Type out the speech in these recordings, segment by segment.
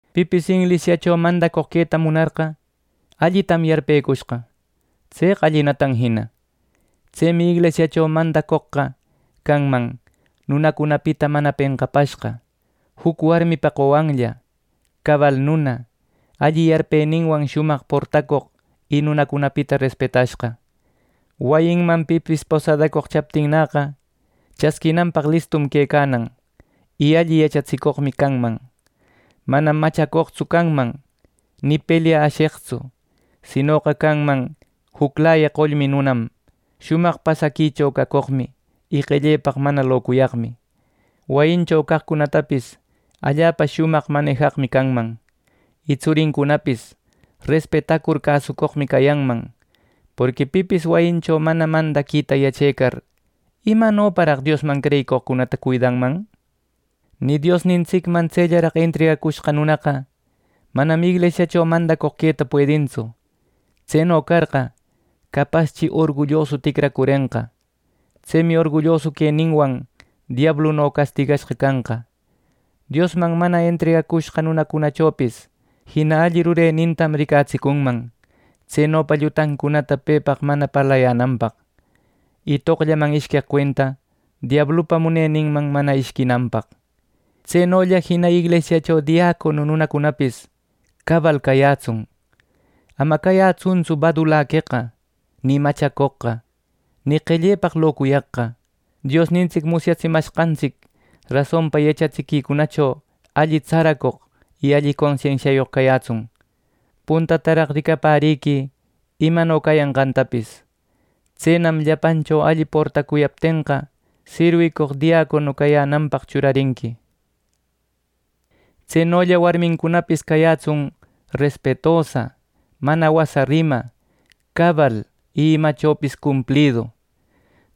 Pipis inglisiacho mandacoq queta munarqa, allitam yarpecushqa. Tseqa allinatam jina. Tsemi inglisiacho mandacoqqa canman: nunacunapita mana penqapashqa, juc warmipa qowanlla, cabal nuna, alli yarpeninwan shumaq portacoq y nunacunapita respetashqa. Wayinman pipis posadacoq chaptinnäqa, chasquinanpaq listum quecanan, y alli yachatsicoqmi canman. Manam machacoqtsu canman ni pelya asheqtsu; sinoqa canman juclaya qollmi nunam, shumaq pasaquicho cacoqmi y qellepaq mana locuyaqmi. Wayincho caqcunatapis allapa shumaq manijaqmi canman, y tsurincunapis respetacur cäsucoqmi cayanman. Porqui pipis wayincho mana mandaquita yachecar ¿Imanoparaq Diosman creyicoqcunata cuidanman! Nï Diosnintsicman tsellaraq entregacushqa nunaqa manam inglisiacho mandacoq queta puedintsu. Tseno carqa, capaschi orgullosu ticracurenqa. Tsemi orgullosu queninwan diabluno castigashqa canqa. Diosman mana entregacushqa nunacunachopis jina alli rurenintam ricatsicunman, tsenopa llutancunata pepaq mana parlayänanpaq, y toqllaman ishqueq cuenta diablupa muneninman mana ishquinanpaq. Tsenolla jina inglisiacho diacono nunacunapis cabal cayätsun. Ama cayätsuntsu badulaqueqa, ni machacoqqa, ni qellepaq locuyaqqa. Diosnintsic musyatsimashqantsic rasonpa yachatsiquicunacho alli tsaracoq y alli consensiayoq cayätsun. Puntataraq ricapäriquï imano cayanqantapis. Tsenam llapancho alli portacuyaptenqa, sirwicoq diacono cayänanpaq churarinqui. Tsenolla warmincunapis cayätsun respetosa, mana wasa rima, cabal y imachopis cumplidu.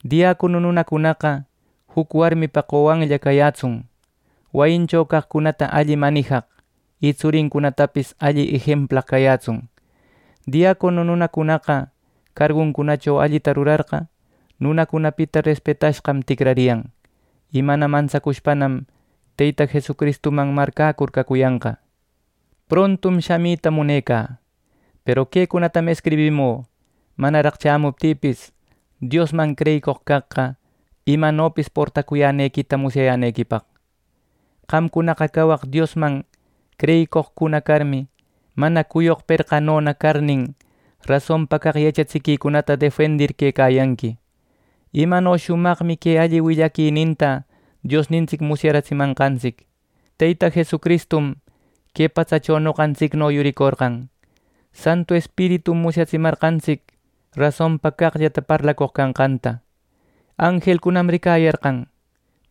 Diacono nunacunaqa juc warmipa qowanlla cayätsun. Wayincho caqcunata alli manijaq y tsurincunatapis alli ejemplaq cayätsun. Diacono nunacunaqa, carguncunacho allita rurarqa, nunacunapita respetashqam ticrariyan. Y mana mantsacushpanam Teyta Jesucristuman marcäcur cacuyanqa. Prontum shamita munecä, peru quecunatam escribimü manaraq shamuptïpis, Diosman creyicoq caqqa imanopis portacuyänequita musyayänequipaq. Qamcunaqa cawaq Diosman creyicoqcuna carmi, mana cuyoq perqanona carnin, rasonpa caq yachatsiquicunata defendir quecayanqui. Imano shumaqmi que alli willaquininta Diosnintsic musyaratsimanqantsic: Teyta Jesucristum que patsacho noqantsicno yuricorqan. Santu Espiritum musyatsimarqantsic rasonpa caqllata parlacoq canqanta. Anjelcunam ricayarqan.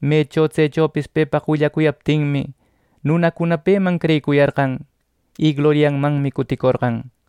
Mecho tsechopis pepaq willacuyaptinmi, nunacuna peman creyicuyarqan, y gloriamanmi cuticorqan.